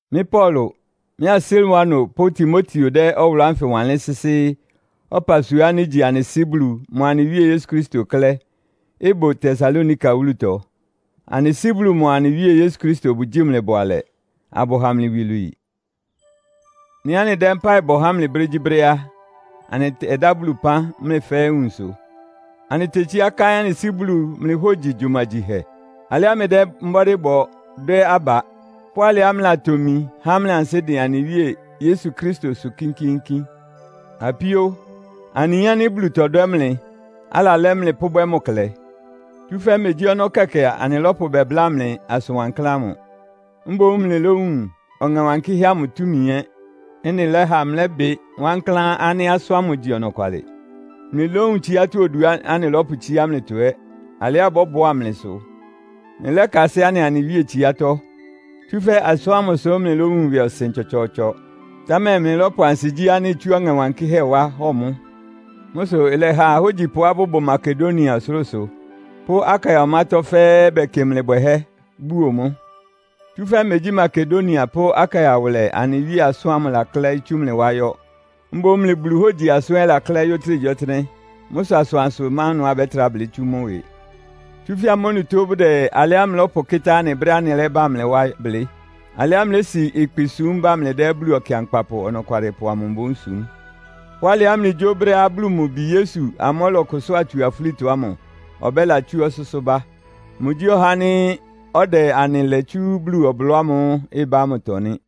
Mɩ́ Paulo, mɩ́a Silwano pʋ́ Timoteo dɛ́ ɔwʋlʋ́ ánfɩ wanlɩ́n sɩ́sɩ́ ɔpasua ánɩ́ ígyi anɩ Sɩ́ Bulu mʋa anɩ Wíe Yesu Kristo klɛ́, ɩbʋ Tesalonika wúlutɔ. Anɩ Sɩ́ Bulu mʋa anɩ Wíe Yesu Kristo bʋgyíi mlɩ bʋalɛ, abʋha mlɩ iwilwii. Nɩ́ anɩdɛ́ mpáɩ bɔ há mlɩ brégyíbrɛ́ á, anɩtɛdá Bulu ɩpán mlɩ fɛ́ɛ́ nwunsʋ. Anɩtetsíá káɩ́n anɩ Sɩ́ Bulu mlɩ hógyi gyumagyihɛ. Alɩá mlɩdɛ́ mbɔ́dɩ́ bɔ dwɛ́ aba, pʋ́ alɩá mlɩlatomi há mlɩ ansɩ́ dɩn anɩ Wíe Yesu Kristosʋ kínkíínkín. Apíó, anɩyin ánɩ́ Bulu tɔdwɛ́ mlɩ, alalɛ́ mlɩ pʋ́bwɛ́ mʋ klɛ. Tsúfɛ́ megyí ɔnɔ́ kɛkɛ anɩlɔ́pʋ bɛbláa mlɩ asʋn wankláán ámʋ. Mboún mlɩlówun Ɔŋɛ́ Wankɩ́hɛ́ amʋ túmi ɛ́. Ɩ́nɩ lɛ́ha mlɩlɛ́bɩ wankláán ánɩ́ asʋ́n ámʋ igyi ɔnɔkwalɩ. Mlɩlówun tsiátɔ́ oduá anɩlɔ́pʋtsíá mlɩtɔ ɛ́, alɩá ɩbɔ́bʋá mlɩ sʋ. Mlɩlɛ́kasɩ́ anɩa anɩ Wíe tsiátɔ́. Tsúfɛ́ asʋ́n ámʋ sʋ mlɩlówun ɩwɩɔsɩn tsɔtsɔɔtsɔ, támɛ mlɩlɔ́pʋ ansigyí ánɩ́ itsú Ɔŋɛ Wankɩ́hɛ́ wá hɔ mʋ́. Mʋ́ sʋ ɩlɛha ahógyipʋá bʋbʋ Makedonia ɔsʋlʋ́sʋ pʋ́ Akaia ɔmátɔ́ fɛ́ɛ́ bɛkɩ mlɩ bwɛhɛ́, buo mʋ́. Tsúfɛ́ megyí Makedonia pʋ́ Akaia wʋlɛ anɩ Wíe asʋ́n ámʋ lɛklɛɩ́ tsú mlɩ wá yɔ́. Mboún mlɩ Bulu hógyi asʋ́n ɛ́ laklɛ́ɩ́ yɔ́ ɔtɩ́nɛgyíɔtɩ́nɛ́. Mʋ́ sʋ asʋansʋ má ɩnʋá abɛ́trá blɩ́ tsú mʋ́ ɩwɩ. Tsúfɛ́ amʋ́ onutó bʋdɛ alɩá mlɩlɔ́pʋkɩ́tá anɩ brɛ́á anɩlɛ́bá mlɩ wá blɩ́. Alɩá mlɩlési ɩkpɩ súm ba mlɩdɛ́ Bulu Ɔkɩankpapʋ Ɔnɔkwalɩpʋ amʋ mboún súm. Pʋ́ alɩá mlɩgyó brɛ́á Bulu mʋ Bi Yesu ámʋ́ʋ́ ɔlɔkʋsʋ́a tsu afúlitɔ ámʋ ɔbɛ́latsú ɔsʋ́sʋ́ bá. Mʋgyí ɔhá ánɩ́ ɔdɛ anɩ lɛ tsú Bulu ɔblɔ́ ámʋ́ʋ́ ɩbá ámʋtɔ nɩ́.